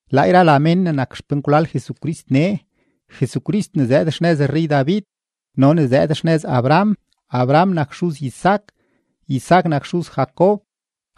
Laa yra la mén ne nak xpenkwlal Jesucrist nee, Jesucrist ne zëëd xnëz rrey-David no ne zëëd xnëz Abraham. Abraham nak xuz Isaac, Isaac nak xuz Jacob,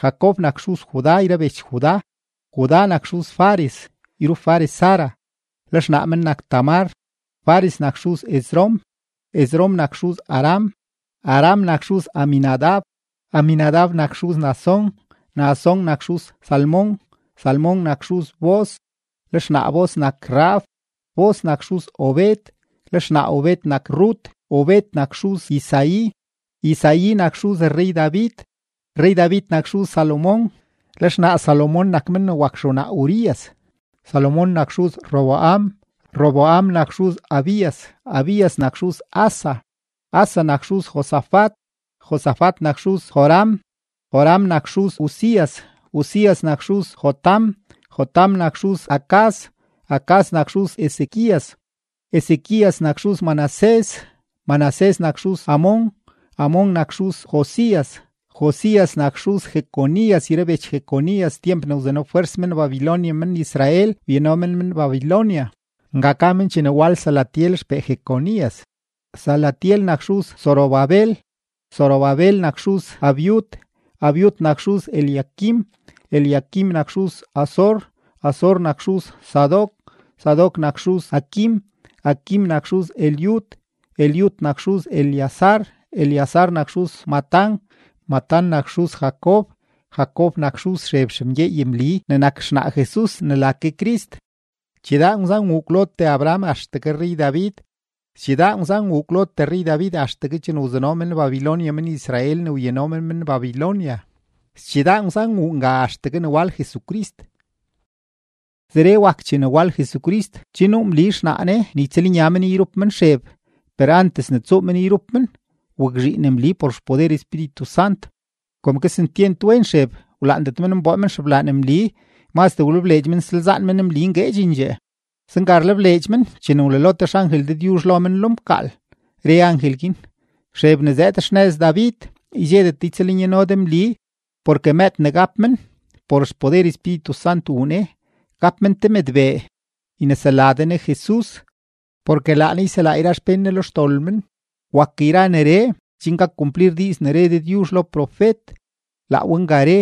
Jacob nak xuz Judá yra bech Judá, Judá nak xuz Fares yrup Fares Zara, le xnaa men nak Tamar, Fares nak xuz Esrom, Esrom nak xuz Aram, Aram nak xuz Aminadab, Aminadab nak xuz Naasón, Naasón nak xuz Salmón, Salmón nak xuz Booz, le xnaa Booz nak Rahab, Booz nak xuz Obed, le xnaa Obed nak Rut, Obed nak xuz Isaí, Isaí nak xuz rrey-David, rrey-David nak xuz Salomón, le xnaa Salomón nak men ne wak xewnaa Urías. Salomón nak xuz Roboam, Roboam nak xuz Abías, Abías nak xuz Asa, Asa nak xuz Josafat, Josafat nak xuz Joram, Joram nak xuz Uzías, Uzías nak xuz Jotam, Jotam nak xuz Acaz, Acaz nak xuz Ezequías, Ezequías nak xuz Manasés, Manasés nak xuz Amón, Amón nak xuz Josías, Josías nak xuz Jeconías yra bech Jeconías tyemp ne wzanofwers men-Babilonia men-Israel wyano men men Babilonia. Nga ka men chene wal Salatiel xpee Jeconías. Salatiel nak xuz Zorobabel, Zorobabel nak xuz Abiud, Abiud nak xuz Eliaquim, Eliaquim nak xuz Azor, Azor nak xuz Sadoc, Sadoc nak xuz Aquim, Aquim nak xuz Eliud, Eliud nak xuz Eleazar, Eleazar nak xuz Matán, Matán nak xuz Jacob, Jacob nak xuz Xeb xemgyeey Mli ne nak xnaa Jesus ne la ke Crist. Chidaa ngwzan wuu kwlotee Abraham axtegue rrey-David, schidaa ngwzan wuu kwlotee rrey-David axtegue chene wzano men-Babilonia men-Israel ne wyano men men Babilonia, schidaa ngwzan wuu nga axtegue ne wal Jesucrist. Zeree wak chene wal Jesucrist: Che nuu Mli xnaa Ne ne ytsëlnya men yrup men Xeb; per antes ne tsuu men yrup men, wakzhiin Mli por xpoder Espíritu Sant. Kom kesentyent wen Xeb, wlaandet men nboo men xeblaan Mli; mazdee wlebleedx men nsalzaan men Mli ngueedxendxee. Zenga rlebleedx men chene wlalo te xangel Dëdyuzh lo men lo mkaal, re angel guin: ―Xeb ne zëëd xnëz David, ydxedet de ytsëlnyano de Mli, porke mëëd ne gap men, por xpoder Espíritu Sant wuu ne. Gap men te mëdbee, ynesela de ne JESUS, porke laa ne yselaa yra xpén ne lo xdol men. Wak yra neree chen gak kumplir diiz ne re Dëdyuzh lo profet, laa we nga re: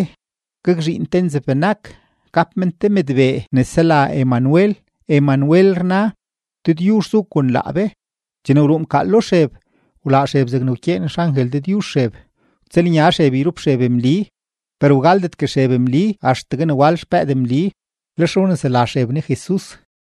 Gakzhiin te nzeb-benak, gap men te mëdbee ne sela Emanuel. Emanuel rna: Dëdyuzh zu kon laa be. Chene wruu mkaal lo Xeb, wlaa Xeb zegne wkyeen xangel Dëdyuzh Xeb. Wtsëlnya Xeb yrup Xeb Mli. Per wgaldetgue Xeb Mli axtegue ne wal xpëëd Mli. Lex wnesela Xeb ne JESUS.